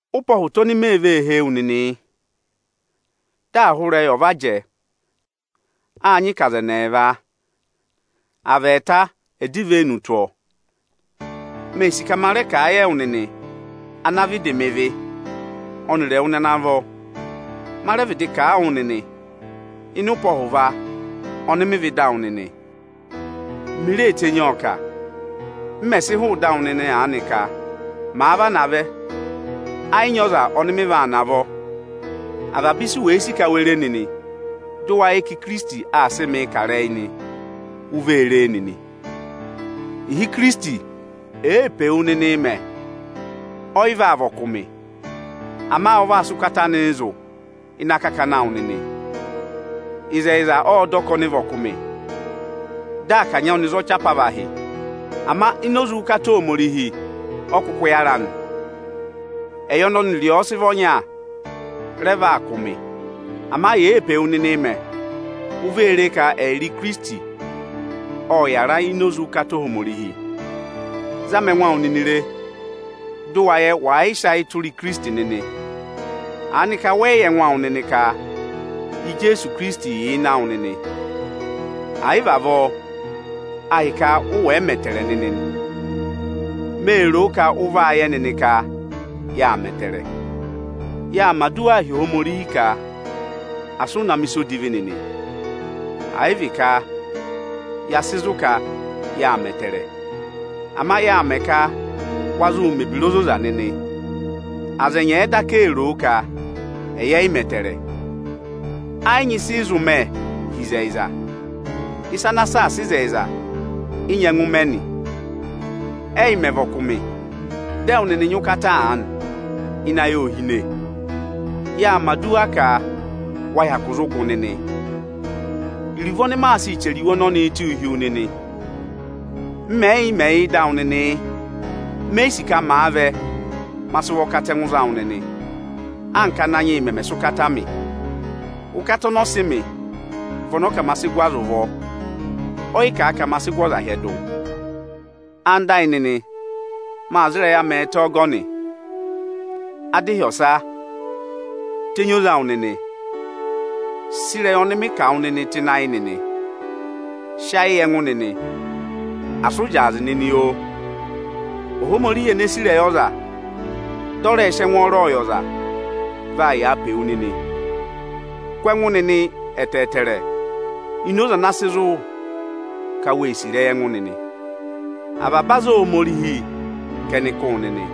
Ụpẹ ọhụta oni mee vee hee wu nịnị yị. Dị ịrẹyị ọ̀ va nyị ahụ jẹẹ, â nyị ka aza ẹnị ẹẹva, à vị ẹẹta ẹ̀ dọ ivenu tụ́ ọọ. Mee sì ka ma rẹ kà a yị ẹwụ nịnị ana vịdị mẹ vị ọnịrị ẹwụ nịnị ana vọ; ma rẹ vịdị kà a wụ nịnị ịnị ụpẹ ọhụva ọnị mị vẹ ịdị awụ nịnị. Mi ree tenyi ọọ kà, m mẹ̀ sị hụụ ịdị awụ nịnị aanị ka: Màa vana vẹ, ẹ yị nyị ọza ọnị maa navọ. Avaba ịsị u wee sì ka we re nịnị dị ụ wa yẹ ka Ikirisiti aa sị mị ị kà ịrẹyị nị, u vee re e nịnị. Ịhị Ikirisiti èee pe wu nịnịị mẹ, ọ yị vaa vị ọkụmị, ama ọ vaa sị ụkata anịị zụ̀ ịnị akakana awụ nịnị. Ịzẹyịza ọ́ dọ ka ọnị vị ọkụmị dị à kanyị ọnị za ọchị apavahị; ama ini oze ụkata Ohomorihi ọ kụkụ yára nị. Ẹyị ọnị ọnịrịị sị vị ọnya rẹ vị ọkụmị ịzẹyịza, ama ịnị uze ọnị ẹyịrị ẹwụ nịnị aà mẹ, u vee re ka ẹyịrị Ikirisiti ộ yàra ini oze ụkata Ohomorihi. Zama ẹngụ awụ nịnị re, dị ụ wa yẹ wàa yị sị ayị tụra Ikirisiti nịnị! Aanị ka wẹ yị yẹ ẹngụ awụ nịnị ka Ijeesu Ikirisiti yà ịnị ayị awụ nịnị? À yị vị avọọ, ahịka ụ wẹ̀ yị kụkụ mẹ ẹtẹẹrẹ nịnị nị. Mee ro ka ụ vaa yẹ nịnị ka yâ mẹ ẹtẹẹrẹ. Yaa mẹ̀ aduwaa hi Ohomorihi ka asị ụ na mẹ̀ ịsa odivi nịnị. Ẹ yị vị ka ya sị zụ̀ ka yaa mẹ ẹtẹẹrẹ. Ama yaa mẹ̀ ẹ ka wa zụụ mẹ̀ ebira ozoza nịnị; aza ẹ nyị ẹ̀ẹ daka ee ro o ka ẹyị ẹ yị mẹ ẹtẹẹrẹ. Ẹ yị nyị ịsị ị zụ mẹ hi ịzẹyịza, ịsa ana saasa ịzẹyịza ị nyẹngụ mẹ nị. Ẹ́yị mẹ̀ vị ọkụmị, dị ẹwụ nịnị nyị ụkata aanị, ịnẹ ayị ô hine. Yaa mẹ̀ aduwa ka wa hyakụ zụ gụ nịnị. Iruvo ọnị maa sịị chẹrẹ iwe ọnọnịị tụ́ụ hi wu nịnị m mẹ̀ yị yà ịdị awụ nịnị yị: Me yi sì ka màa vẹ, ma sị ụvọ ọkatẹngụ za wụ nịnị, anka Ananyị yị mẹ̀ sị ụkata mị. Ụkata ọnị ọ sị mị vị ọnị ọ kà ma sịị gụ aza ụvọ, ọ yị kà ka ma sịị gụ ọzaa hyẹdụ. Ẹwụ nịnị ẹyịnyara amị, maa za ịrẹyị amị ẹtẹ ọgọnị. Adịhyọsa nịnị o. Tenyi oze awụ nịnị! Saasa ịrẹyị ọnị mị kà wụ nị aanị o! Sị ayị yị ẹngụ nịnị, asị ụ zyaazị nịnị oo! Ohomorihi eneē sì ịrẹyị ọza dị ọ rẹẹ̄ sị ẹngwọọrọ yị ọza, vaa yàa pe wu nịnị. Kụ́ ẹngụ nịnị ẹtẹẹtẹrẹ ini oze ana sị zụ ka wee sì ịrẹyị ẹngụ nịnị. Avaba aza Ohomorihi ka ẹnị kụ́ wụ nịnị.